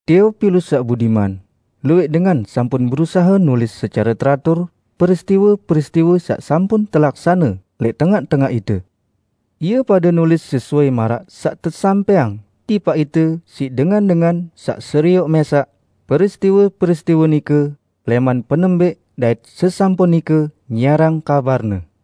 Teopilus saq budiman, Luwẽq dengan sampun berusahe nulis secare teratur peristiwe-peristiwe saq sampun telaksane lẽq tengaq-tengaq ite. Ie pade nulis sesuai maraq saq tesampẽang tipaq ite siq dengan-dengan saq serioq mẽsaq peristiwe-peristiwe nike lẽman penembẽq dait sesampun nike nyiarang kabarne.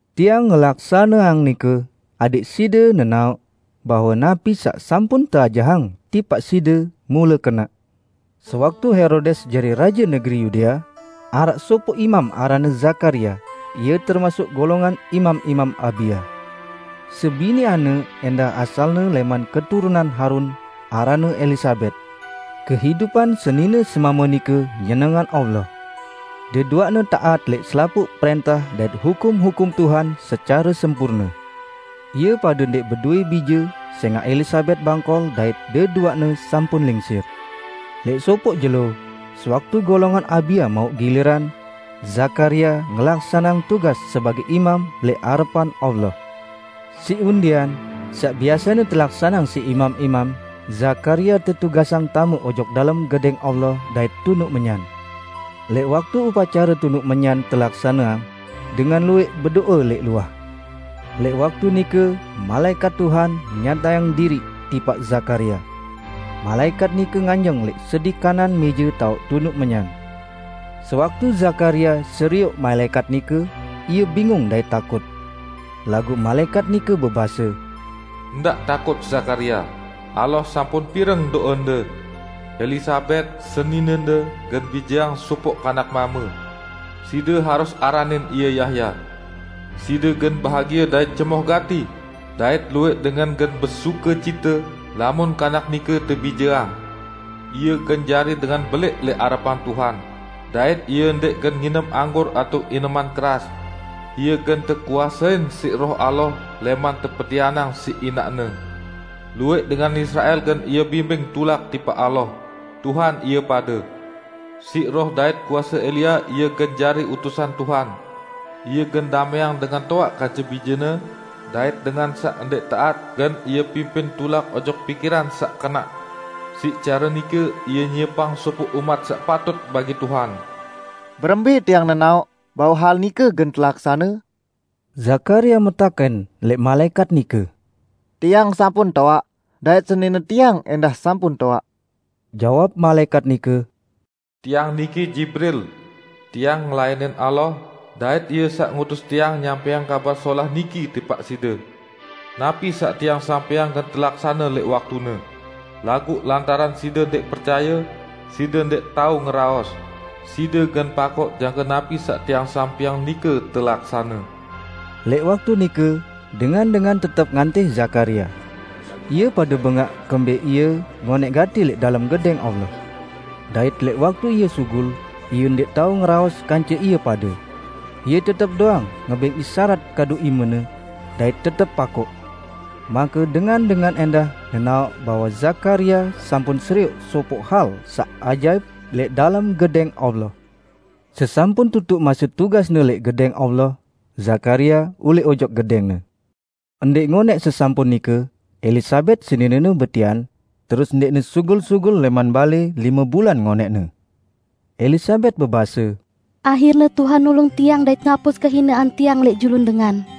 Tiang ngelaksaneang nike, adẽq side nenaoq bahwe napi saq sampun teajahang tipaq side mule kenaq. Sewaktu Herodes jari raje negeri Yudea, araq sopoq imam aranne Zakaria. Ie termasuk golongan imam-imam Abia. Sebiniqanne ẽndah asalne lẽman keturunan Harun, aranne Elisabet. Kehidupan senine-semame nike nyenengang Allah. Deduaqne taat lẽq selapuq prẽntah dait hukum-hukum Tuhan secare sempurne. Ie pade ndẽq bedowẽ bije sẽngaq Elisabet bangkol dait deduaqne sampun lingsir. Lẽq sopoq jelo, sewaktu golongan Abia mauq giliran, Zakaria ngelaksaneang tugas sebagẽ imam lẽq arepan Allah. Siq undian, saq biasene telaksaneang siq imam-imam, Zakaria tetugasang tame ojok dalem Gedẽng Allah dait tunuq menyan. Lẽq waktu upacare tunuq menyan telaksaneang, dengan luwẽq bedo'e lẽq luah. Lẽq waktu nike malaẽkat Tuhan nyatayang diriq tipaq Zakaria. Malaẽkat nike nganjeng lẽq sedi kanan mẽje taoq tunuq menyan. Sewaktu Zakaria serioq malaẽkat nike, ie bingung dait takut. Laguq malaẽkat nike bebase, "Ndaq takut, Zakaria! Allah sampun pireng do'ende. Elisabet, seninende gen bijeang sopoq kanak mame. Side harus aranin ie Yahya. Side gen bahagie dait cemoh gati, dait luwẽq dengan gen besukecite lamun kanak nike tebijeang! Ie gen jari dengan belẽq lẽq arepan Tuhan, dait ie ndẽq gen nginem anggur atao ineman keras. Ie gen tekuasein siq Roh Allah lẽman tepetianang siq inaqne. Luwẽq dengan Israel gen ie bimbing tulak tipaq Allah, Tuhan ie pade. Siq roh dait kuase Elia ie gen jari utusan Tuhan. Ie gen damẽang dengan toaq kance bijene, dait dengan saq ndẽq taat gen ie pimpin tulak ojok pikiran saq kenaq. Siq care nike ie nyiepang sopoq umat saq patut bagi Tuhan." "Berembẽ tiang nenaoq bahwe hal nike gen telaksane?" Zakaria metakẽn lẽq malaẽkat nike. "Tiang sampun toaq dait senine tiang ẽndah sampun toaq." Jawab malaẽkat nike, "Tiang niki Jibril. Tiang ngelayanin Allah dait Ie saq ngutus tiang nyampẽang kabar solah niki tipaq side. Napi saq tiang sampẽang gen telaksane lẽq waktune. Laguq lantaran side ndẽq percaye, side ndẽq tao ngeraos; side gen pakoq jangke napi saq tiang sampẽang nike telaksane." Lẽq waktu nike, dengan-dengan tetep ngantih Zakaria. Ie pade bengaq kembẽq ie ngonẽq gati lẽq dalem Gedẽng Allah. Dait lẽq waktu ie sugul, ie ndẽq tao ngeraos kance ie pade. Ie tetep doang ngebẽng isarat kadu imene, dait tetep pakoq. Make dengan-dengan ẽndah nenaoq bahwe Zakaria sampun serioq sopoq hal saq ajaip lẽq dalem Gedẽng Allah. Sesampun tutuq mase tugasne lẽq Gedẽng Allah, Zakaria ulẽq ojok gedẽngne. Ndẽq ngonẽq sesampun nike, Elisabet seninene betian, terus ndẽqne sugul-sugul lẽman lime bulan ngonẽqne. Elisabet bebase, "Ahirne Tuhan nulung tiang dait ngapus kehinean tiang lẽq julun dengan."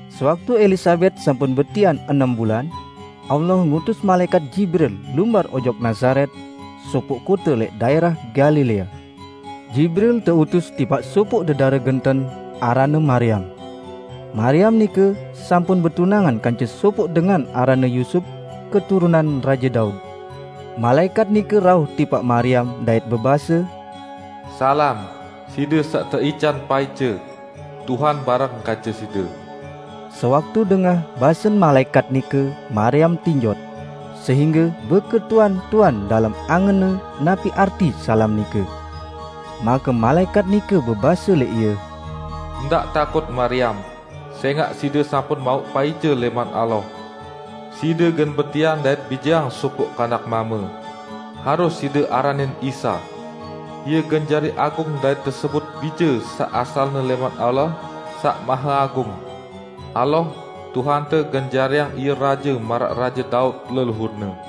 Sewaktu Elisabet sampun betian enem bulan, Allah ngutus malaẽkat Jibril lumbar ojok Nazaret, sopoq kote lẽq daẽrah Galilea. Jibril teutus tipaq sopoq dedare genten, aranne Mariam. Mariam nike sampun betunangan kance sopoq dengan aranne Yusup, keturunan Raje Daud. Malaẽkat nike rauh tipaq Mariam dait bebase, "Salam, side saq teican paice! Tuhan bareng kance side!" Sewaktu dengah basen malaẽkat nike Mariam tinjot, sehingge beketuan-tuan dalem angenne napi arti salam nike. Make malaẽkat nike bebase lẽq ie, "Ndaq takut Mariam! Sẽngaq side sampun mauq paice lẽman Allah. Side gen betian dait bijeang sopoq kanak mame. Harus side aranin Isa. Ie gen jari agung dait tesebut Bije saq asalne lẽman Allah Saq Maheagung. Allah, Tuhante gen jariang Ie raje maraq Raje Daud, leluhur-Ne.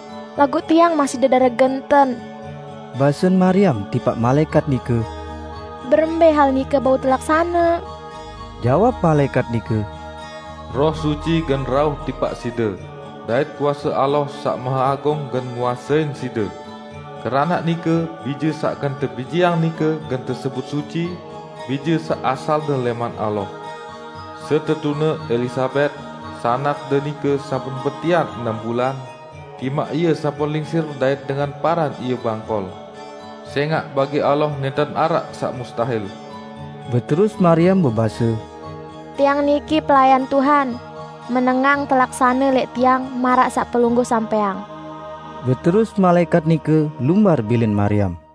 "Laguq tiang masih dedare genten," basen Mariam tipaq malaẽkat nike, "berembẽ hal nike bau telaksane?" Jawab malaẽkat nike, "Roh Suci gen rauh tipaq side, dait kuase Allah Saq Maheagung gen nguasein side. Keranaq nike bije saq gen tebijeang nike gen tesebut suci, Bije saq asalne lẽman Allah. Setetune Elisabet, sanakde nike sampun betian enem bulan, timaq ie sampun lingsir dait dengan paran ie bangkol. Sẽngaq bagi Allah nẽnten araq saq mustahil." Beterus Mariam bebase, "Tiang niki pelayan Tuhan; menengang telaksane lẽq tiang maraq saq pelungguh sampẽang." Beterus malaẽkat nike lumbar bilin Mariam.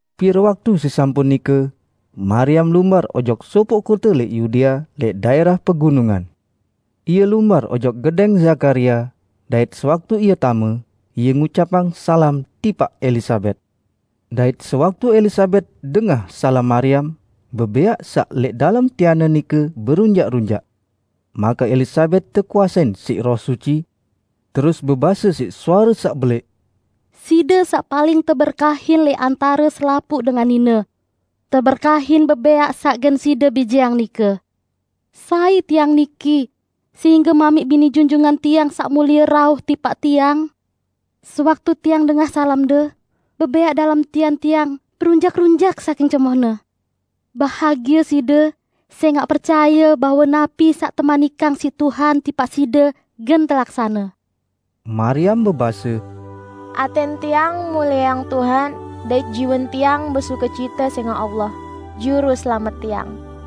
Pire waktu sesampun nike, Mariam lumbar ojok sopoq kote lẽq Yudea lẽq daẽrah pegunungan. Ie lumbar ojok gedẽng Zakaria, dait sewaktu ie tame, ie ngucapang salam tipaq Elisabet. Dait sewaktu Elisabet dengah salam Mariam, bebẽaq saq lẽq dalem tianne nike berunjaq-runjaq. Make Elisabet tekuasein siq Roh Suci, terus bebase siq suare saq belẽq, "Side saq paling teberkahin lẽq antare selapuq dengan nine! Teberkahin bebẽaq saq gen side bijeang nike! Sai tiang niki sehingge mamiq bini Junjungan tiang Saq Mulie rauh tipaq tiang? Sewaktu tiang dengah salamde, bebẽaq dalem tian tiang berunjaq-runjaq saking cemohne. Bahagie side, sẽngaq percaye bahwe napi saq temanikang siq Tuhan tipaq side gen telaksane!" Mariam bebase, "Atẽn tiang mulieang Tuhan, dait jiwen tiang besukecite sẽngaq Allah, Juruselamet tiang.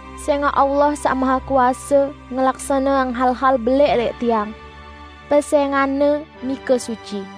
Sẽngaq Allah Saq Mahekuase ngelaksaneang hal-hal belẽq lẽq tiang. Pesẽngan-Ne nike suci.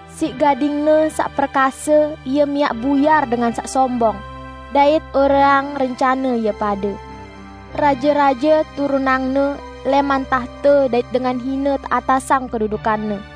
Siq gading-Ne saq perkase Ie miaq buyar dengan saq sombong, dait oreang rencane ie pade. Raje-raje turunang-Ne lẽman tahte dait dengan hine teatasang kedudukanne.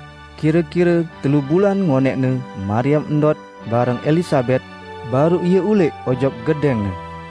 Kire-kire telu bulan ngonẽqne Mariam ndot bareng Elisabet, baruq ie ulẽq ojok gedẽngne.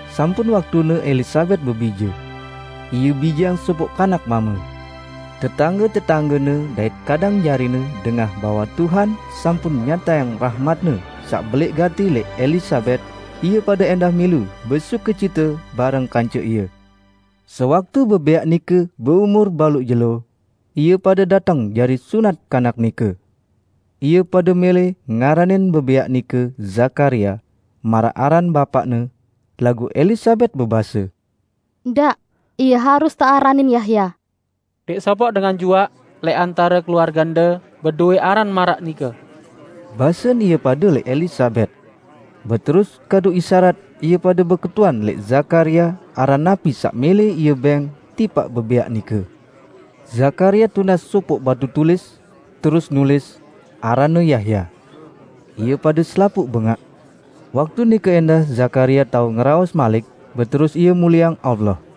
Sampun waktune Elisabet bebije. Ie bijeang sopoq kanak mame. Tetangge-tetanggene dait kadang jarine dengah bahwe Tuhan sampun nyatayang rahmat-Ne saq belẽq gati lẽq Elisabet, ie pade ẽndah milu besukecite bareng kance ie. Sewaktu bebẽaq nike beumur baluq jelo, ie pade dateng jari sunat kanak nike. Ie pade mẽlẽ ngaranin bebẽaq nike Zakaria, maraq aran bapaqne, laguq Elisabet bebase, "Ndaq, ie harus tearanin Yahya!" "Ndẽq sopoq dengan juaq lẽq antare keluargende bedowẽ aran maraq nike," basen ie pade lẽq Elisabet. Beterus kadu isarat ie pade beketuan lẽq Zakaria aran napi saq mẽlẽ ie bẽng tipaq bebẽaq nike. Zakaria tunas sopoq batu tulis, terus nulis, "Aranne Yahya." Ie pade selapuq bengaq. Waktu nike ẽndah Zakaria tao ngeraos malik beterus ie mulieang Allah.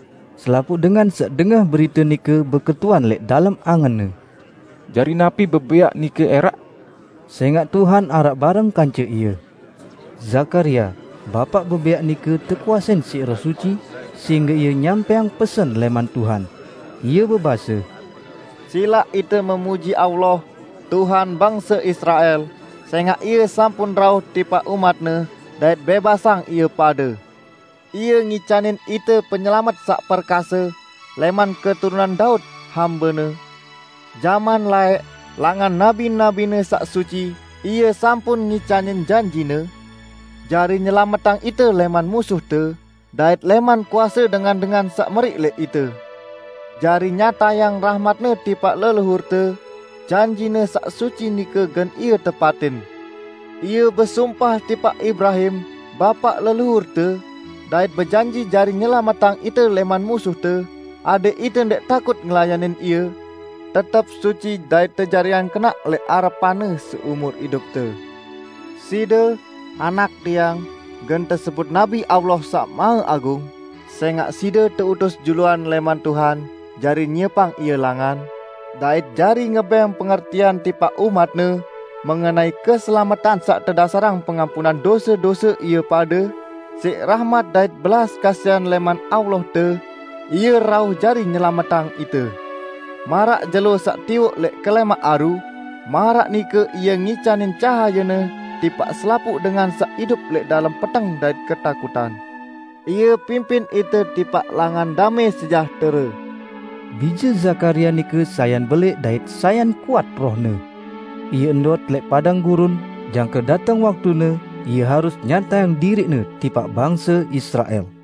Selapuq dengan saq dengah berite nike beketuan lẽq dalem angenne, "Jari napi bebẽaq nike ẽraq?" Sẽngaq Tuhan araq bareng kance ie. Zakaria, bapaq bebẽaq nike tekuasein siq Roh Suci, sehingge ie nyampẽang pesen lẽman Tuhan. Ie bebase, "Silaq ite memuji Allah, Tuhan bangse Israel, sẽngaq Ie sampun rauh tipaq umat-Ne dait bẽbasang ie pade. Ie ngicanin ite penyelamet saq perkase, lẽman keturunan Daud, hambe-Ne. Jaman laẽq, langan nabi-nabi-Ne saq suci, Ie sampun ngicanin janji-Ne jari nyelametang ite lẽman musuhte, dait lẽman kuase dengan-dengan saq meriq lẽq ite. Jari nyatayang rahmat-Ne tipaq leluhurte, janji-Ne saq suci nike gen Ie tepatin. Ie besumpah tipaq Ibrahim, bapaq leluhurte, dait bejanji jari nyelametang ite lẽman musuhte, adẽq ite ndẽq takut ngelayanin Ie, tetep suci dait tejariang kenaq lẽq arepan-Ne seumur idupte. Side, anak tiang, gen tesebut nabi Allah Saq Maheagung, sẽngaq side teutus juluan lẽman Tuhan jari nyiepang Ie langan, dait jari ngebẽng pengertian tipaq umat-Ne mengenai keselametan saq tedasarang pengampunan dose-dose ie pade, siq rahmat dait belas kasihan lẽman Allahte, Ie rauh jari nyelametang ite. Maraq jelo saq tiwoq lẽq kelẽmaq aru, maraq nike Ie ngicanin cahaye-Ne tipaq selapuq dengan saq idup lẽq dalem peteng dait ketakutan. Ie pimpin ite tipaq langan damẽ sejahtere." Bije Zakaria nike sayan belẽq dait sayan kuat rohne. Ie ndot lẽq padang gurun, jangke dateng waktune ie harus nyatayang diriqne tipaq bangse Israel.